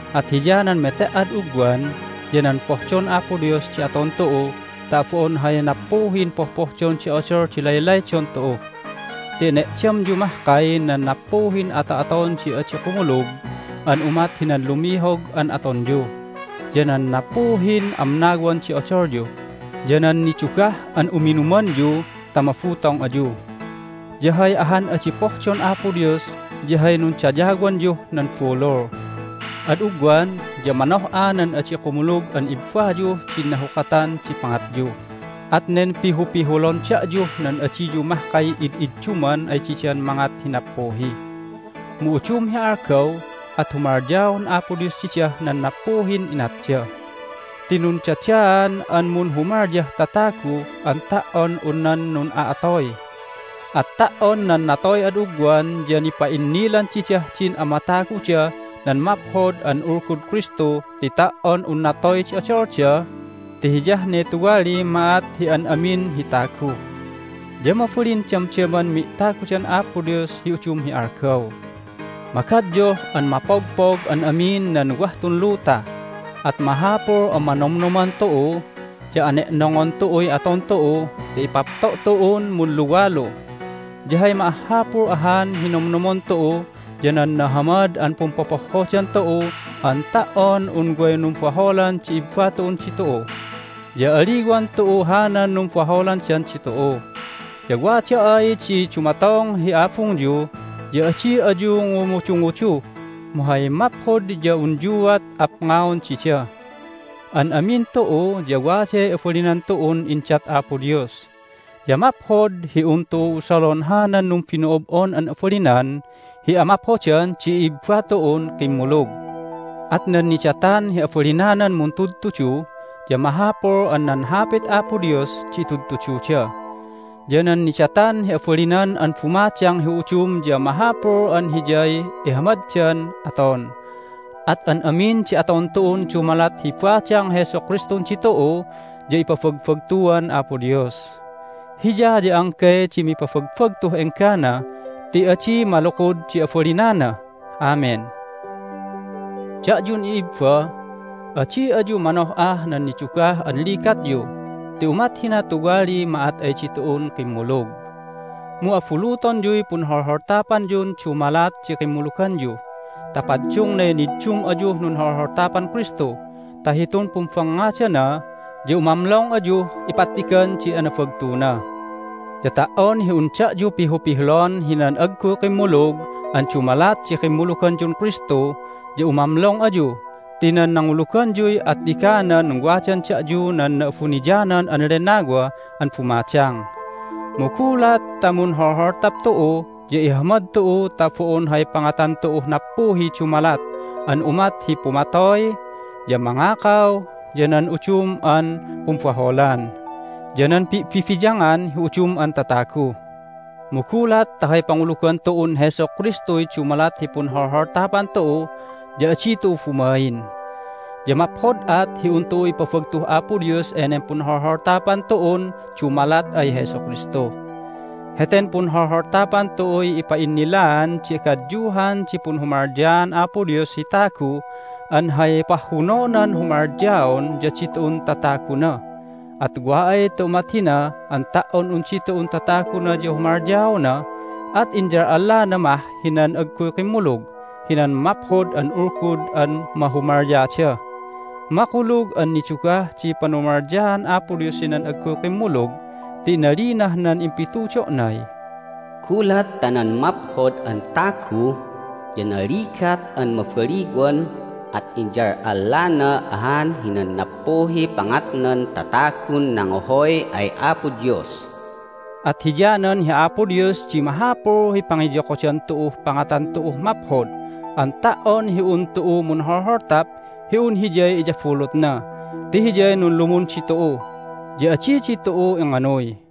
At hiyanan mete"ad ugwan ya nan pohdon Apo Dios di aton tu'u ta bo'on hay nappuhin pohpohdon di odol di laylaydon tu'u. Ti ene'damyu mahkay nan nappuhin ato'aton di adi kumulug an umat hinan lumihog an atonyu, ya nan nappuhin amnawan di odolyu, ya nan nidugah an uminumanyu ta mabutong ayu. Ya hay ahan adi pohdon Apo Dios ya hay nundayawanyuh nan bulul. Ad ugwan ya manoh'a nan adi kumulug an ibbayuh din nahukatan di pangatyu, at nen pihupihulon da'yuh nan adiyu mahkay id'idduman ay didan mangat hi nappuhi. Mu udum hi algaw at humalyaon Apo Dios didah nan nappuhin inatda. Ti nundadaan an munhumalyah tatagu an ta"on un nan nun'a'atoy. At ta"on nan natoy ad ugwan ya nipa'innilan didah din amataguda nan Maphod an Ulgud Kristu ti ta"on un natoy di odolda (ti hiyah ne tuwaliy ma'at hi an amin hi tagu) ya mabalin damdaman mi'tagudan Apo Dios hi udum hi algaw. Magadyuh an mapogpog an amin nan wah tun luta, at mahapul an manomnoman tu'u, ya ane'nongon tu'uy aton tu'u ta ipapto' tu'un munluwalu. Ya hay ma'ahhapul ahan hi nomnomon tu'u ya nan nahamad an pumpopohhodan tu'u an ta"on un way numbaholan di ibba tu'un ditu'u, ya aliwan tu'u hanan numbaholandan ditu'u. Ya wada ay di dumatong hi abungyu ya adi ayu ngumudungudu, mu hay maphod ya unyuat apngaon dida. An amin tu'u ya waday abalinan tu'un indat Apo Dios, ya maphod hi un tu'u usalon hanan numbino'ob'on an abalinan hi amaphodan di i'ibba tu'un kimmulug. At nan nidatan hi abalinanan muntudtudu ya mahapul an nan Hapit Apo Dios di itudtududa. Ya nan nidatan hi abalinan an bumadang hi udum ya mahapul an hiyay ihamaddan aton. At an amin di aton tu'un dumalat hi badang Jesu Kristun ditu'u ya ipabagbagtuan Apo Dios. Hiya ya anggay di mipabagbagtuh enggana ti adi malukud di abalinana! Amen. Da'yun i'ibba, adi ayu manoh'ah nan nidugah an ligatyu ti umat hina tuwaliy ma'at ay ditu'un kimmulug. Mu abulutonyuy punholholtapanyun dumalat di kimmuluganyu ta paddungnay niddum ayuh nunholholtapan Kristu ta hitun pumbangngadana ya umamlong ayuh ipattigan di anabagtuna. Ya ta"on hi un da'yu pihupihulon hinan agguy kimmulug an dumalat di kimmuluganyun Kristu ya umamlong ayu ti nan nanguluganyuy attiganan wadan da'yu nan Na'abuniyanan an Lennawa an bumadang. Mu gulat ta munholholtap tu'u ya ihamad tu'u ta bo'on hay pangatan tu'uh nappuhiy dumalat an umat hi pumatoy, ya mangakaw, ya nan udum an pumbaholan, ya nan pi'bibiyangan hi udum an tatagu. Mu gulat ta hay pangulugan tu'un Jesu Kristuy dumalat hi punholholtapan tu'u ya adi tu'u bumain. Ya maphod at hi un tu'u ipabagtuh Apo Dios enen punholholtapan tu'un dumalat ay Jesu Kristu. Heten punholholtapan tu'uy ipa'innilaan di agadyuhan di punhumalyaan Apo Dios hi tagu an hay pahhunonan humalyaon ya ditu'un tataguna. At wa ay ta umat hina an ta"on un ditu'un tataguna ya humalyaona at inyal'allana mah hinan agguy kimmulug hinan Maphod an Ulgud an mahumalyada. Makulug an nidugah di panumalyaan Apo Dios hinan agguy kimmulug ti inalinah nan impitudo'nay, "Gulat ta nan maphod an tagu ya naligat an mabaliwan at inyal'allana ahan hinan nappuhiy pangatnan tatagun nangohoy ay Apo Dios." At hiyanan hi Apo Dios di mahapul hi pangiyokodan tu'uh pangatan tu'uh maphod an ta"on hi un tu'u munholholtap hi un hiyay iyabulutna ti Hiyay nunlumun ditu'u, ya adi ditu'u inganuy.